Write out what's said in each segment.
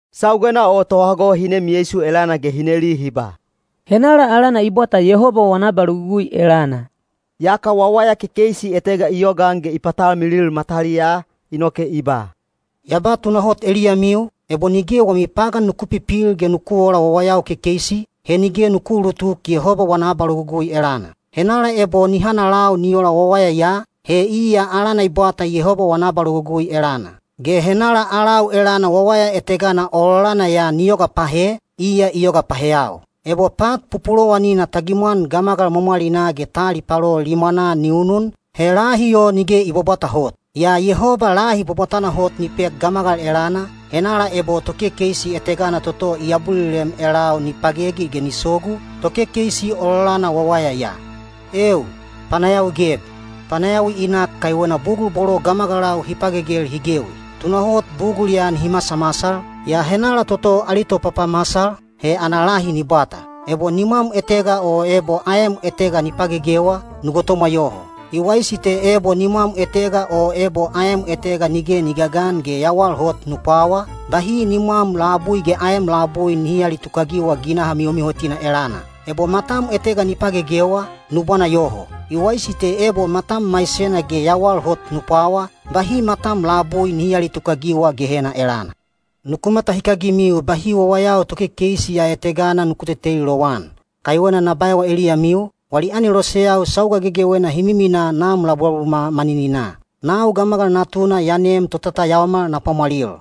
Saugena o tohago hi nem Yeisu elana ge hi neli hi ba, “Henala alana i bwata Yehoba wana abalogugui elana?” Yaka wawaya kekeisi etega i yogaan ge i patalmilil mataliyaa, inoke i ba, “Ya ba tunahot eliyamiu, ebo nige wami pagan nuku pipil ge nuku oola wawayau kekeisi, he nige nuku uulutuk Yehoba wana abalogugui elana. Henala ebo ni hanalau ni ola wawaya ya, he iya alana i bwata Yehoba wana abalogugui elana. Ge henala alau elana wawaya etegana ololana ya ni yoga pahe, iya i yoga paheyau. Ebo pat pupulowanina ta gimwan gamagal mwamwalinaa ge ta alipalo limwana ni unun, he lahi o nige i bwabwata hot. Yaa Yehoba lahi bwabwatana hot ni pek gamagal elana, henala ebo tokekeisi etegana toto i abulilem elau ni pagegi ge ni sogu, tokekeisi ololana wawaya ya. Eeu, panayawi geb! Panayawi i nak kaiwena bugul bolo gamagalau hi pagegel hi gewi. Tunahot bugul ya nihi masamasal, yaa henala toto ali topapamasal, he ana lahi ni bwata. Ebo nimwam etega o ebo aem etega ni pagegewa, nu gotomwa yoho. I waisi te ebo nimwam etega o ebo aem etega nige ni gagan ge yawal hot nu pwawa, bahi nimwam labui ge aem labui nihi aalitukagiwa ginaha mihomihotina elana. Ebo matam etega ni pagegewa, nu bwana yoho. I waisi te ebo matam maisena ge yawal hot nu pwawa, bahi matam labui nihi aalitukagiwa Gehena elana. Nuku matahikagimiu bahi wawayau tokekeisi ya etegana nuku teteli lowan. Kaiwena na baewa eliyamiu, wali aneloseyau sauga gegewena hi miminaa Nam labulabumwa manininaa. Nau Gamagal Natuna ya nem totatayaomal na pwamwalil.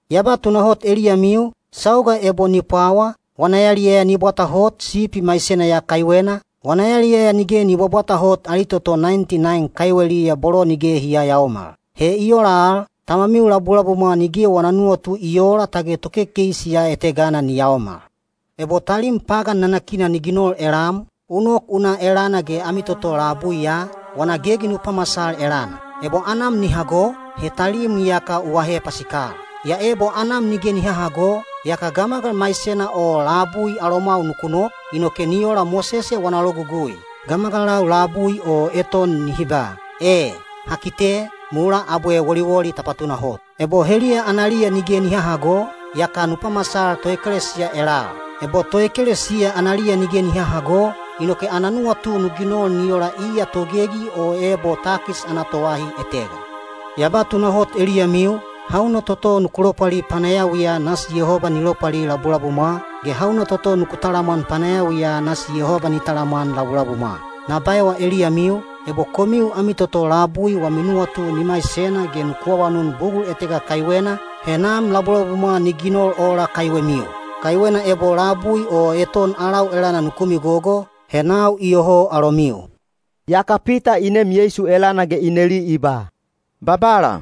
Ya ba tunahot eliyamiu, sauga ebo ni pwawa, wana yaliyaya ni bwata hot sipi maisena ya kaiwena, wana yaliyaya nige ni bwabwata hot ali toto naenti naen kaiweliya bolo nige hi yayaomal. He i ola al, Tamamiu labulabumwa nige wana nuwatu i oola tage tokekeisi ya etegana ni yaomal. Ebo talim pagan nanakina ni ginol elam, u nok u na elana ge ami toto labui ya, wana gegi nu pamasal elana. Ebo anam ni hago, he talim iyaka u ahe pasikal. Yaa ebo anam nige ni hahago, yaka gamagal maisena o labui alomwau nuku nok, inoke ni ola Mosese wana logugui: gamagalau labui o eton nihi ba, ‘E, ha kite,’ mulaa abwe woliwoli ta patunahot. Ebo heliya analiya nige ni hahago, yaka nu pamasal toekelesiya elal. Ebo toekelesiya analiya nige ni hahago, inoke ana nuwatu nu ginol ni ola iya togegi o ebo takis ana toahi etega. Ya ba tunahot eliyamiu, hauna toto nuku lopwali panayawiya nasi Yehoba ni lopwali labulabumwa, ge hauna toto nuku talamwan panayawiya nasi Yehoba ni talamwan labulabumwa. Na baewa eliyamiu, ebo komiu ami toto labui wami nuwatu ni maisena ge nuku awanun bugul etega kaiwena, he Nam labulabumwa ni ginol ola kaiwemiu. Kaiwena ebo labui o eton alau elana nuku migogo, he nau iyoho alomiu.” Yaka Pita i nem Yeisu elana ge i neli i ba, “Babala,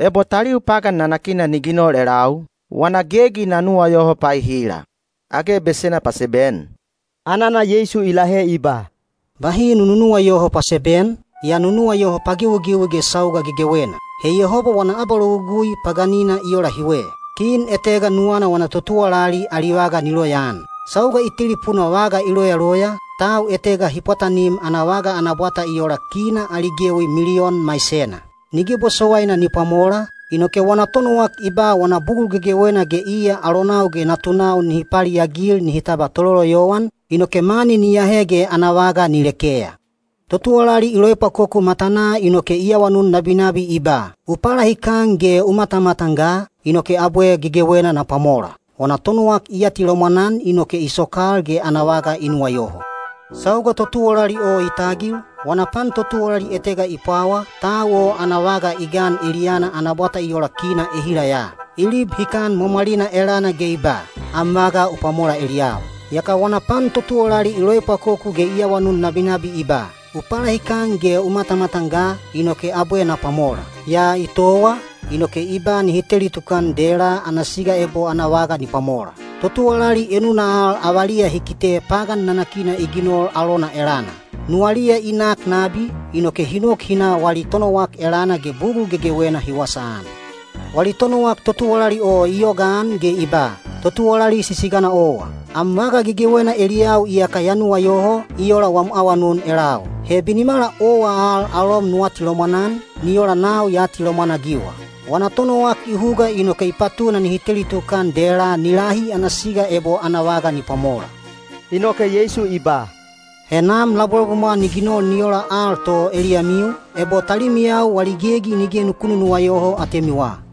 ebo taliu pagan nanakina ni ginol elau, wana gegi na nuwayoho paehila? Age besena paseben?” Anana Yeisu i lahe i ba, “Bahi nu nunuwayoho paseben, yaa nu nuwayoho pagewigewi ge sauga gegewena. He Yehoba wana abalogugui paganina i ola hiwe. Kin etega nuwana wana totuwalali ali vaga ni loyaan. Sauga i telipuna vaga i loyaloya, tau etega hi pwatanim ana vaga ana bwata i ola kina ali gewi miliyon maisena. Nige bosowaina ni pwamola, inoke wana tonowak i ba wana bugul gegewena ge iya alonau ge natunau nihi paliagil nihi tabwa tololoyowan, inoke mani ni ahe ge ana vaga ni lekeya. Totuwalali i loepwakoku matanaa inoke i awanun nabinabi i ba, ‘U palahikan ge u matamatan ga, inoke abwe gegewena na pwamola.’ Wana tonowak i atilomwan-an inoke i sokal ge ana vaga i nuwayoho. Sauga totuwalali o i tagil, wana pan totuwalali etega i pwawa, tau o ana vaga i gan eliyana ana bwata i ola kina ehila ya. I lib hikan mwamwalina elana ge i ba, ‘Am vaga u pwamola eliyau.’ Yaka wana pan totuwalali i loepwakoku ge i awanun nabinabi i ba, ‘U palahikan ge u matamatan ga, inoke abwe na pwamola.’ Yaa i towa, inoke i ba nihi teli tukan dela ana siga ebo ana vaga ni pwamola. Totuwalali enuna al avaliya hi kite pagan nanakina i ginol alona elana. Nuwaliya i nak nabi, inoke hi nok hi na wali tonowak elana ge bugul gegewena hi wasaan. Wali tonowak totuwalali o i yogaan ge i ba, ‘Totuwalali sisigana owa. Am vaga gegewena eliyau iyaka ya nuwayoho, i ola wam awanun elau. He binimala owa al alom nu atilomwan-an, ni ola nau ya atilomwan-agiwa.’ Wana tonowak i huga inoke i patuna nihi teli tukan dela ni lahi ana siga ebo ana vaga ni pwamola.” Inoke Yeisu i ba, “He Nam labulabumwa ni ginol ni ola al to eliyamiu, ebo talimiyau wali gegi nige nuku nunuwayoho atemiwa.”